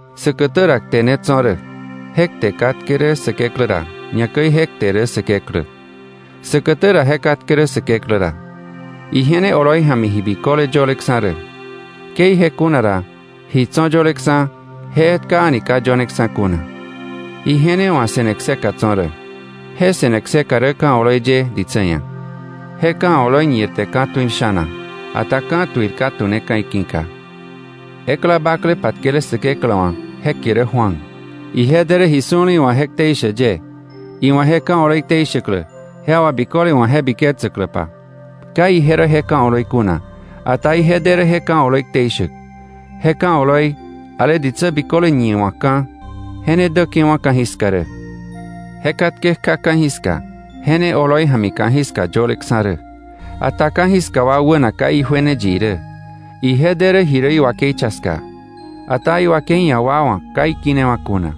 Säkätä ra Kte ne tso̱ rä. Je Kte katke rä Säkeklä ra, ñakäi je Kte rä Säkeklä. Säkätä ra je katke rä Säkeklä ra. Ije ne oloi ja̱mi ji biköle yöleksa̱ rä. Ke ije kuna ra, ji tso̱ yöleksa̱, je etka a̱ni ka yöneksa̱ kuna. Ije ne wa̱ se̱ne kseka tso̱ rä. Je se̱ne kseka rä ka̱ oloi ye ditsä ia̱. Je ka̱ oloi ñirte ka̱tuil sha̱na, ata ka̱tuil ka tu̱neka̱ iki̱ka. Ekla bakle patkele Säkeklä wa̱, je kie rä Juan. Ije de rä ji su̱le iwa̱ je ktei shäk ye, iwa̱ je ka̱ oloi ktei shäklä, je wà biköle wa̱ je biketsäkläpa. Ka ije rä je ka̱ oloi kuna, ata ije de rä je ka̱ oloi ktei shäk. Je ka̱ oloi, ale ditsä biköle ñiwa̱kka̱, je ne däke̱wa̱ ka̱jiska rä. Je katke kja ka̱jiska, je ne oloi ja̱mi ka̱jiska yöleksa̱ rä. Ata ka̱jiska wa wäna ka ijuene yi irä. Ije de rä ji rä iwakei cha ska, ata iwakei ia̱ wa wa̱ ka ikinewa̱ kuna.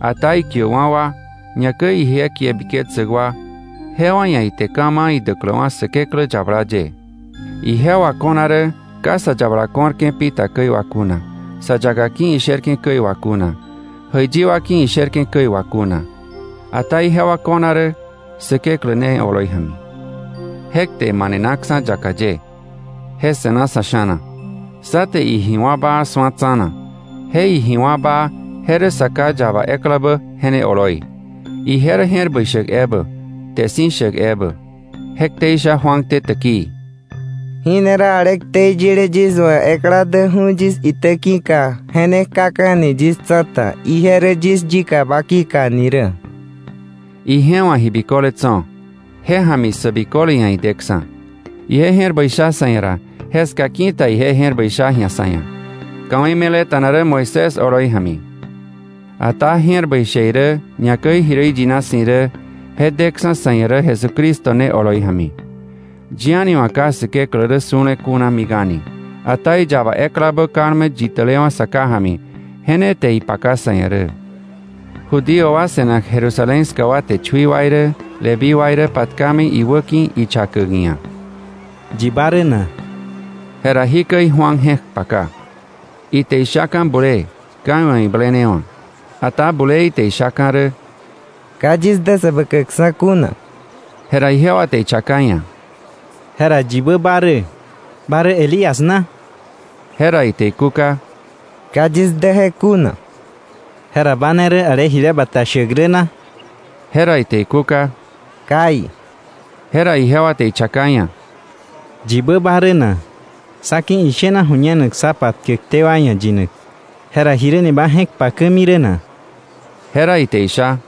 Ata ikiäkwa̱ wa, ñakäi ikie biketsäk wa, jewa ia̱ ite ka̱ ma̱ idäkläwa̱ Säkeklä yabala ye. Ijewa ko̱na rä ka sa yabala ko̱rke̱ pi ta käi wà kuna, sa yaka ki̱ isherke̱ käi wà kuna, jäiyi wa ki̱ isherke̱ käi wà kuna, ata ijewa ko̱na rä Säkeklä ne oloi ja̱mi. Je Kte manenaksa̱ yaka ye, je se̱na sa̱ sha̱na. Sá te iji wá̱ baa su̱a tsa̱na, je iji wá̱ baa je rä Sa Ká yaba eklabä je ne oloi. Ije rä je̱r bäi shäk ebä, kte si̱ shäk ebä. Je ktei sha Juan te täkii: “Jí ne rä ale ktei yile yis wa̱ ekla däkju̱ yis itä ki̱ka, je ne kjaka̱ni yis tsa̱ta, ije rä yis yikaba ki̱ka ni rä.” Ije wa̱ ji biköle tso̱, je ja̱mi sä biköle ia̱ ideksa̱. Ije je̱r bäi sha sa̱ ia̱ ra, jeska ki̱ta ije je̱r bäi sha ji̱a sa̱ ia̱. Ka̱wei me̱leta̱na rä Moisés oloi ja̱mi. Ata je̱r bäi she irä, ñakäi ji rä iyina si̱ irä, je deksa̱ sa̱ ia̱ rä Jesucristo ne oloi ja̱mi. Yi a̱ni wa̱ ka Säkeklä rä su̱le kuna mik a̱ni, ata iyaba eklabä kalme yitälewa̱ Sa Ká ja̱mi, je ne te ipaka sa̱ ia̱ rä. Judío wa se̱nak Jerusalén ska wa te chui wa irä Leví wa irä patkami iwäki̱ ichakäk iia̱: “¿Yi ba rä na?” Jera jikäi Juan je̱k paka. Ite ishaka̱ bulee, ka iwa̱ iblenewa̱. Ata bulee ite ishaka̱ rä: —Ka yis dä Säbäkäkksa̱ kuna. Jera ijewa te ichaka iia̱: —¿Jera yibä ba rä? ¿Ba rä Elías na? Jera ite ikúka: —Ka yis dä je kuna. —¿Jera ba ne rä ale jile bata shäk rä na? Jera ite ikúka: —Kai. Jera ijewa te ichaka iia̱: —¿Yibä ba rä na? Sá ki̱ ishena ju̱ñenak sá patkäkté wa ia̱ yinak. Jera ¿jiräni ba je̱k pakämi rä na? Jera ite isha: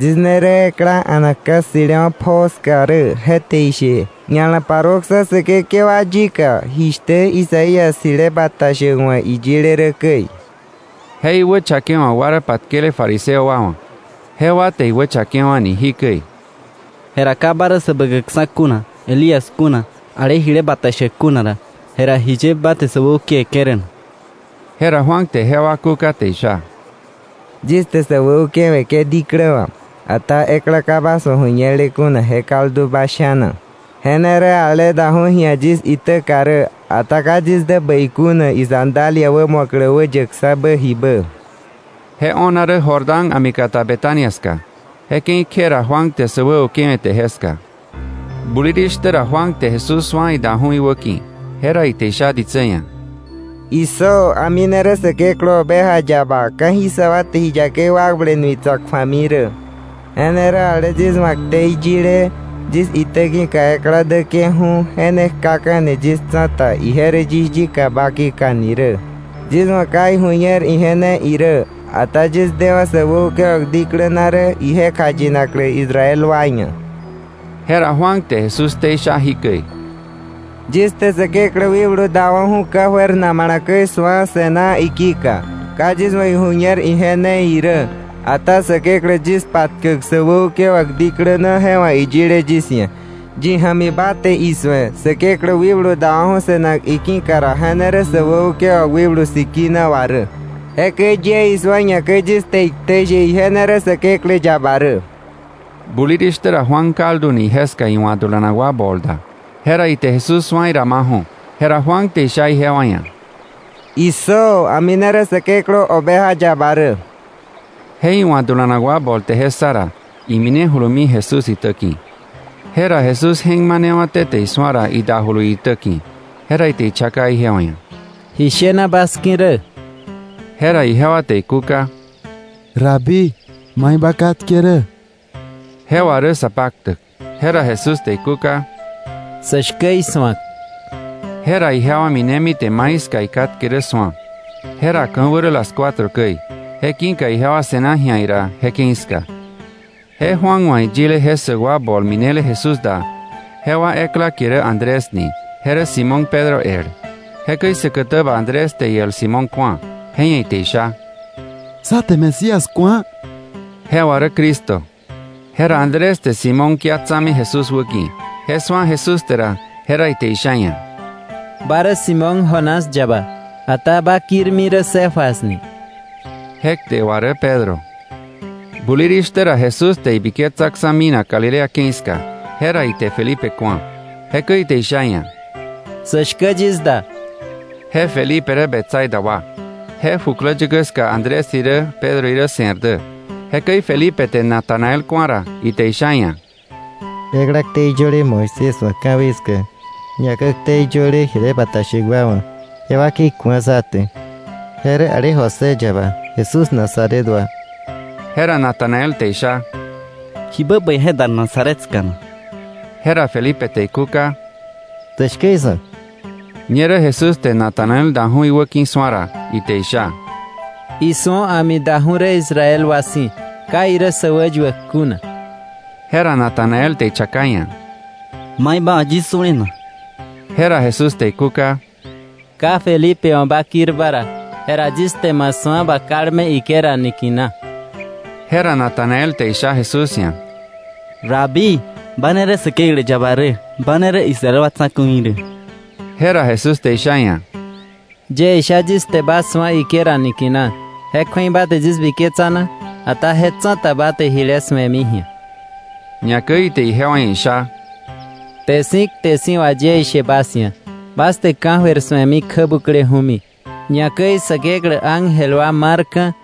—Yis ne rä ekla a̱nak ka̱ ssi̱lewa̱ pjoo ska rä. Je te ishe: ‘Ña̱la paruöksa̱ Säkekewa yika’, jishtä Isaías jile bata shäk wa̱ iyile rä käi. Je iwächakewa̱k wa rä patkele fariseo wa wa̱. Jewa te iwächakewa̱ni jikäi: —Jera ka ba rä Säbäkäkksa̱ kuna, Elías kuna, ale jile bata shäk kuna ra, jera ¿jiye ba te sä wäukewe̱ke̱ rä na? Jera Juan te jewa kúka te isha: —Yis te sä wäukewe̱ke̱ diklä wà, ata ekla ka bas wa̱ ju̱ñele kuna je kaldu bas sha̱na. Je ne rä ale daju̱ ji̱a yis itäka rä, ata ka yis dä bäi kuna isandalia wämu̱aklä wäyäkksa̱bä jibä. Je o̱na rä Jordán a̱mi kata Betania ska. Je ke̱i kje ra Juan te sä wäukewe̱te jeska. Bulirishtä ra Juan te Jesús su̱a idaju̱ iwäki̱. Jera ite isha ditsä ia̱: “¡Issö, a̱mi ne rä Säkeklä Oveja yaba, ka̱jiska wa te ji yakei wakble nui tsa̱k ju̱ami rä! Je ne rä ale yis wa̱ ktei yile: ‘Yis itä ki̱ka ekla däke̱ju̱, je ne kjaka̱ni yis tsa̱ta, ije rä yis yikaba ki̱ka ni rä.’ Yis wa̱ ka iju̱ñer ije ne irä, ata yis dewa̱ sä wäukewa̱k diklä na rä ije kjayinaklä Israel wa ia̱.” Jera Juan te Jesús ktei sha jikäi: —Yis te Säkeklä wikblu dawa̱ju̱ ka̱jöir namala käi su̱a, se̱ná iki̱ka. Ka yis wa̱ iju̱ñer ije ne irä, ata Säkeklä yis patkäk sä wäukewa̱k diklä na je wa̱ iyile yis ia̱: “Yi ja̱mi ba te isu̱e Säkeklä Wikblu dawa̱ju̱ se̱nak iki̱ka ra, je ne rä sä wäukewa̱k Wikblu Sikina wà rä.” Jekäi yie isu̱a, ñakäi yis te iktei she ije ne rä Säkeklä yaba rä. Bulirishtä ra Juan kalduni jeska iwa̱ dulanak wa bol da, jera ite Jesús su̱a idamaju̱, jera Juan te isha ijewa ia̱: —¡Issö, a̱mi ne rä Säkeklä Oveja yaba rä! Je iwa̱ dulanak wa bol te je ssa ra, iminejulumi Jesús itä ki̱. Jera Jesús je̱k manewa̱té te isu̱a ra idajulu iitä ki̱. Jera ite ichaka ijewa ia̱: —¿Ji shena bas ki̱ rä? Jera ijewa te ikúka: —Rabí, ¿mai ba katke rä? (Je wà rä Sapaktäk). Jera Jesús te ikúka: —Sä shkä isu̱ak. Jera ijewa minemi te mai ska ikatke rä su̱a. Jera ka̱wä rä las cuatro käi. Je ki̱ka ijewa se̱na ji̱a ira je ke̱i ska. Je Juan wa̱ iyile je ssäk wa bol minele Jesús da, jewa ekla kie rä Andrés ni. Je rä Simón Pedro el. Jekäi säkätäba Andrés te iel Simón ku̱a, je ia̱ ite isha: —Sá te Mesías ku̱a. (Je wà rä Cristo). Jera Andrés te Simón kia tsa̱mi Jesús wäki̱. Je su̱a Jesús te ra, jera ite isha iia̱: —Ba rä Simón, Jonás yaba, ata ba kirmi rä Cefas ni. (Je kte wà rä Pedro). Bulirishtä ra Jesús te ibiketsaksa̱ minak Galilea ke̱i ska. Jera ite Felipe ku̱a. Jekäi ite isha iia̱: —Sä shkä yis da. Je Felipe rä Betsaida wa. Je jukläyäkä ska Andrés irä Pedro irä se̱r dä. Jekäi Felipe te Natanael ku̱a ra, ite isha iia̱: —Ekla ktei yöle Moisés wa̱ ka̱wei ska, ñakäi ktei yöle jile bata shäk wa wa̱, je wakei ku̱a sá te. Je rä ale José yaba, Jesús Nazaret wa. Jera Natanael te isha: —¿Jibä bäi je dar Nazaret ska na? Jera Felipe te ikúka: —Sä shkä isu̱ak. Ñerä Jesús te Natanael daju̱ iwäki̱ su̱a ra, ite isha: —Isu̱o, a̱mi daju̱ rä Israel wa si̱, ka irä sä wäyuäk kuna. Jera Natanael te ichaka iia̱: —¿Mai ba wa̱ yis su̱le na? Jera Jesús te ikúka: —Ka Felipe wa̱ ba kirba ra, jera yis te ma su̱a ba kalme higuera niki̱na. Jera Natanael te isha Jesús ia̱: —Rabí, ba ne rä Säkeklä yaba rä. Ba ne rä Israel wa tsa̱ku̱i rä. Jera Jesús te isha iia̱: —Yie isha yis te ba su̱a higuera niki̱na, ¿je kju̱ei ba te yis biketsa na? Ata je tsa̱ta ba te jile su̱emi ji̱a. Ñakäi ite ijewa ia̱ isha: —Kte si̱ kte si̱ wà yie ishe bas ia̱: Bas te ka̱jöir su̱emi kjä bukleju̱mi, ñakäi Säkeklä ángel wa marka̱,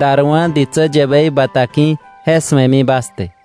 darwa̱ ditsä yäbei bata ki̱, je su̱emi bas te.